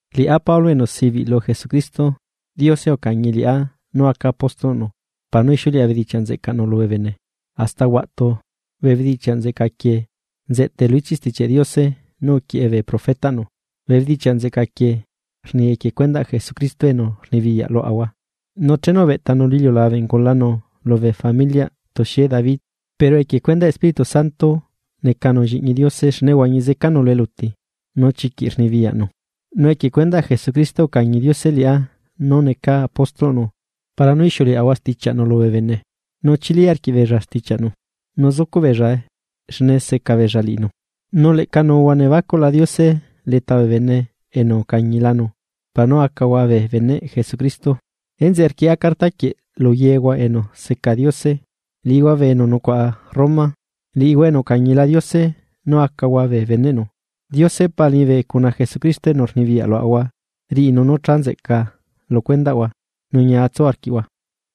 Liꞌá Pablo, enu sibiꞌ lu Jesucristo, Diose ucañi liꞌá nú aca apóstolꞌnu para nú ixiuleꞌa bedichiaꞌ nzeꞌcaꞌnu lubee bene. Hasta huaꞌtu, bee bedichiaꞌ nzeꞌca quieꞌ nzeꞌtae lu ichiꞌ Stichiaꞌ Diose nú uquieꞌe bee profetaꞌnu. Bee bedichiaꞌ nzeꞌca quieꞌ rni equie cuendaꞌ Jesucristo enu rnibiyaꞌ luaꞌahua nu chenu ubeꞌtanu lu iliulabe ungulanu lubee familiaꞌ tuxie David, pero equie cuendaꞌ Espíritu Santo necanu lliꞌñi Diose xne uhuañi zecanu lu eluti, nu chiquiꞌ rluꞌcunu poder. Nu equie cuendaꞌ Jesucristo ucañi Diose liꞌá nú necaa apóstolꞌnu para nú ixiuleꞌahua stichiaꞌnu lubee bene, nú chili arquiꞌbeella stichiaꞌnu nu zucuꞌ beellae xne seca beella liꞌinu. Nu leꞌca nuuhua nebacuꞌla Diose leta bee bene enu ucañilanu, para nú acahua bee beneꞌ Jesucristo. Enzeꞌe rquieꞌa carta quieꞌ luyehua enu seca Diose, liꞌihua bee enu nucuaꞌa Roma, liꞌihua enu ucañila Diose nú acahua bee beneꞌnu. Diose Pa liñibe cuna Jesucristo enu rnibiyaꞌ luaꞌahua riꞌinu nú cha nzeꞌca lucuendaꞌhua nu ñia tsu arquiꞌhua.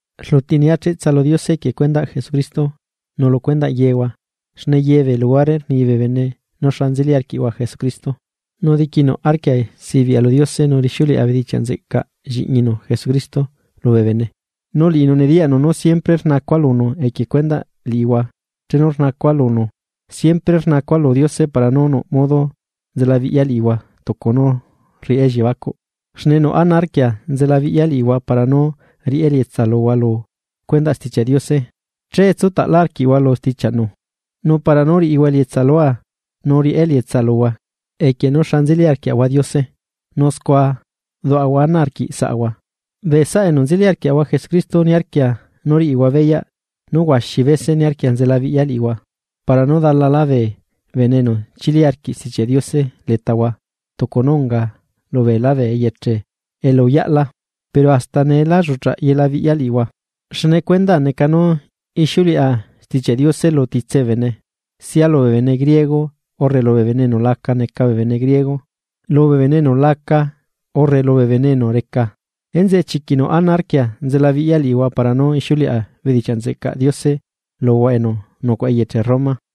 Rluti nia cheꞌtsa lu Diose equie cuendaꞌ Jesucristo lucuendaꞌ yehua xne yebee luhuare rni bee bene nú xa nzeli arquiꞌhua Jesucristo. Nu diquinuꞌ arquia sibiꞌa lu Diose nu rixiuleꞌa bedichiaꞌ nzeꞌcaꞌ lliꞌñinu Jesucristo lubee bene, nu liꞌinu nediyaꞌnu nú siempre rnacua lunu equie cuendaꞌ liꞌihua chenu rnacua lunu. Siempre rnacua lu Diose para nú nuꞌ modo nzelabiꞌya liꞌihua tucu nú rriꞌá elliebacuꞌ. Xne nuꞌ ana arquia nzelabiꞌya liꞌihua para nú riꞌá elietsa luhua lu cuendaꞌ Stichiaꞌ Diose, che tsutaꞌlá arquiꞌhua lu stichiaꞌnu. Nu para nú riꞌihua elietsa lua nu riꞌá elietsa luhua equie nú xa nzeli arquiaꞌahua Diose nu scua duaꞌahua ana arquiꞌsaꞌahua. Bee saꞌa enu nzeli arquiaꞌahua Jesucristo niarquia nu riꞌihua beyaꞌ nú huaxi bese niarquia nzelabiꞌya liꞌihua, para nú dalalá bee bene enu chili arquiꞌ Stichiaꞌ Diose letahua tucu nú unga lubeelá bee eyeche elu uyaꞌla pero hasta nee lá lluꞌcha yela biꞌya liꞌihua. Xne cuendaa neca nú ixiuleꞌa Stichiaꞌ Diose lu titse bee bene, sia lubee bene griego urre lubee bene enu la neca bee bene griego, lubee bene enu laca urre lubee bene enu reca. Enzeꞌe chiquiꞌ nuꞌ ana arquia nzelabiꞌya liꞌihua para nú ixiuleꞌa bedichiaꞌ nzeꞌcaꞌ Diose luhua enu nucuaꞌa eyeche Roma.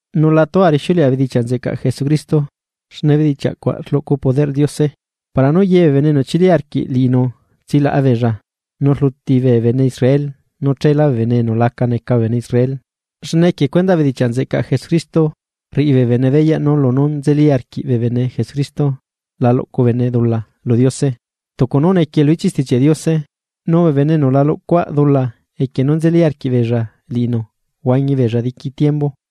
Nu la tua rixiuleꞌa bedichiaꞌ nzeꞌcaꞌ Jesucristo. Xne bedichiaꞌcuaꞌ rluꞌcu poderꞌ Diose. Para nú yebee bene enu chili arquiꞌ liꞌinu tsilaꞌa beella, nu rluti bee bene Israel nu chelá bee bene enu la neca bee bene Israel. Xne equie cuendaꞌ bedichiaꞌ nzeꞌcaꞌ Jesucristo rriꞌi bene beyaꞌ nu lunú nzeli arquiꞌ bene Jesucristo la luꞌcu bene dula lu Diose tucu nú nequie lu ichiꞌ Stichiaꞌ Diose: “Nu bee bene enu la luꞌcuaꞌ dula equie nú nzeli arquiꞌbeella liꞌinu huañi beella diqui tiembu.”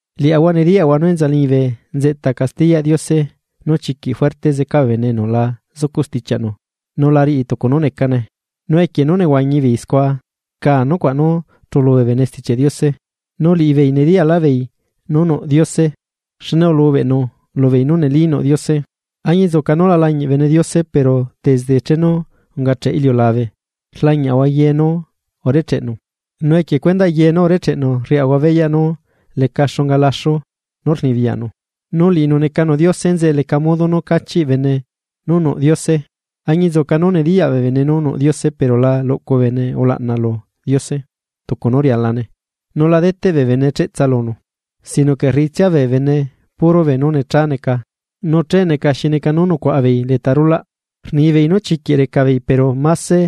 Liaꞌahua nediyaꞌahua nú enza liñibe nzeꞌta castiyaꞌ Diose nu chiquiꞌ juerte zeca bee bene enu la zucuꞌ stichiaꞌnu nu la riꞌi tucu nú necane nu equie nú nehuañi beei scua rca nucuaꞌ nú chulu bee bene Stichiaꞌ Diose. Nu liꞌibeei nediyaꞌlaꞌbeei nú nuꞌ Diose, xne ulubeꞌnu lubeei nú neli nuꞌ Diose. Añinzuca nú la lañiꞌ bene Diose pero desde chenu ungacheꞌ iliulabe rlañiaꞌahua ye nú urecheꞌnu, nu equie cuendaꞌ ye nú urecheꞌnu rriaꞌahua beyaꞌ nú leca xunga laxu poder nú rluꞌcunu, nu liꞌinu necanu Diose, enzeꞌe leca modo nú cachiꞌ bene nú nuꞌ Diose. Añinzuca nú nediyaꞌ bee bene nú nuꞌ Diose pero la luꞌcu bene ulaꞌna lu Diose tucu nú rialane nu la deteꞌ bee bene cheꞌtsa lunu, sino que rriꞌitsia bee bene puro beenú necha neca, nu che neca xi neca nú nucuaꞌabeei leta rulaꞌ. Rnibeei nú chiquiꞌ recabeei pero máse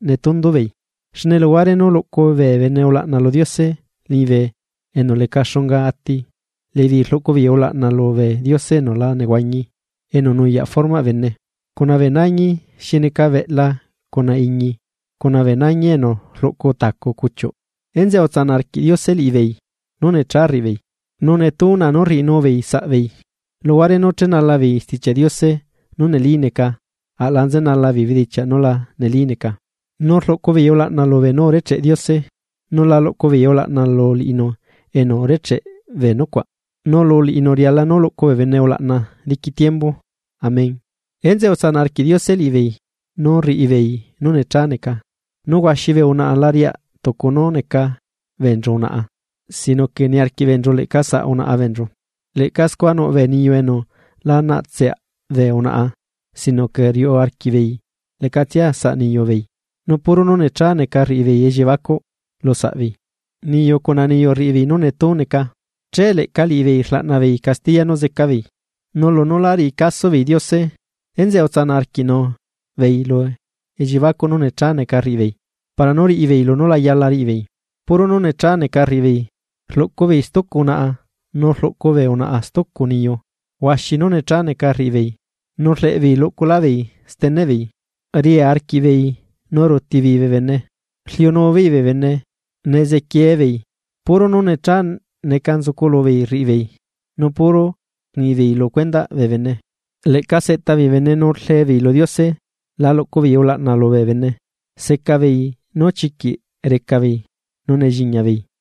netundubeei. Xne luhuare nú luꞌcu bee bene ulaꞌna lu Diose liñibe enu leca xunga ati, liꞌibeei rluꞌcubeei ulaꞌna lubee diose enu la nehuañi, enu nuyaꞌ formaꞌ bene, cuna bee nañi xi neca beꞌla cuna iñi, cuna bee nañi enu rluꞌcu tacu cuchiuꞌ. Enzeꞌe utsanaꞌ arquiꞌ Diose liꞌibeei nú necha rriꞌibeei, nu netú na nú rriꞌinubeei saꞌbeei, luhuare nú chenalabeei Stichiaꞌ Diose nú neli neca, aꞌla nzenalabei bedichiaꞌ nú la neli neca. Nu rluꞌcubeei ulaꞌna lubee nú urecheꞌ Diose, nu la luꞌcubeei ulaꞌna lu liꞌinu enu urecheꞌ bee nucuaꞌ, nu lu liꞌinu riala nú luꞌcu bee bene ulaꞌna diqui tiembu. Amén. Enzeꞌe utsanaꞌ arquiꞌ Diose liꞌibeei nú rriꞌibeei nú necha neca. Nu huaxi bee unaꞌa la riaꞌ tucu nú neca beenchu unaꞌa, sino que niarquiꞌ beenchu leꞌca saꞌ unaꞌa beenchu. Leꞌca scua nuꞌ bee niyu enu la naꞌtseaꞌ bee unaꞌa, sino que riuꞌu arquiꞌbeei leꞌcatsia saꞌ niyubeei, nu puro nú necha neca rriꞌibeei elliebacuꞌ lusaꞌbeei. Niyu cuna niyu rriꞌi beei nú netú neca. Che leꞌca liꞌibeei rlaꞌna beei castiya nú zecabeei. Nu lunú lá riꞌi caso beei Diose, enzeꞌe utsanaꞌ arquiꞌnu beei lu elliebacuꞌ nú necha neca rriꞌibeei para nú riꞌibeei lunú la yala riꞌibeei. Puro nú necha neca rriꞌibeei, rluꞌcubeei stucu unaꞌa nu rluꞌcubee unaꞌa stucu niyu, huaxi nú necha neca rriꞌibeei, rleꞌbeei luꞌcuscaꞌlábeei steneꞌbeei, riaa arquiꞌbeei, ruuti beei bee bene, rliunubeei bee bene, nezequiebeei, puro nú necha neca nzucu lubeei rriꞌibeei, nu puro rnibeei lu cuendaꞌ bee bene. Leꞌca seꞌtabeei bee bene, nu rlebeei lu Diose, la luꞌcubeei ulaꞌna lubee bene, secabeei nú chiquiꞌ recabeei, nu nelliñabeei,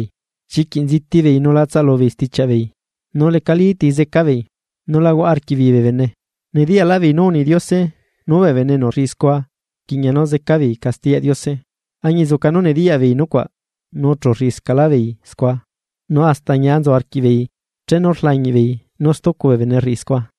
chiquiꞌ nzitibeei nu la tsalubeei stichiaꞌbeei, nu lecalí ti zecabeei, nu la huaꞌa arquiꞌbeei bee bene. Nediyaꞌlaꞌbeei nú uni Diose nú bee bene enu rriꞌi scua rquiꞌña nú zecabeei, castiyaꞌ Diose, añinzuca nú nediyaꞌbeei nucuaꞌ nu chu rriꞌiscaꞌlábeei scua, nu hasta ñia nzu arquiꞌbeei chenu rlañiꞌbeei nú stucu bee bene rriꞌi scua.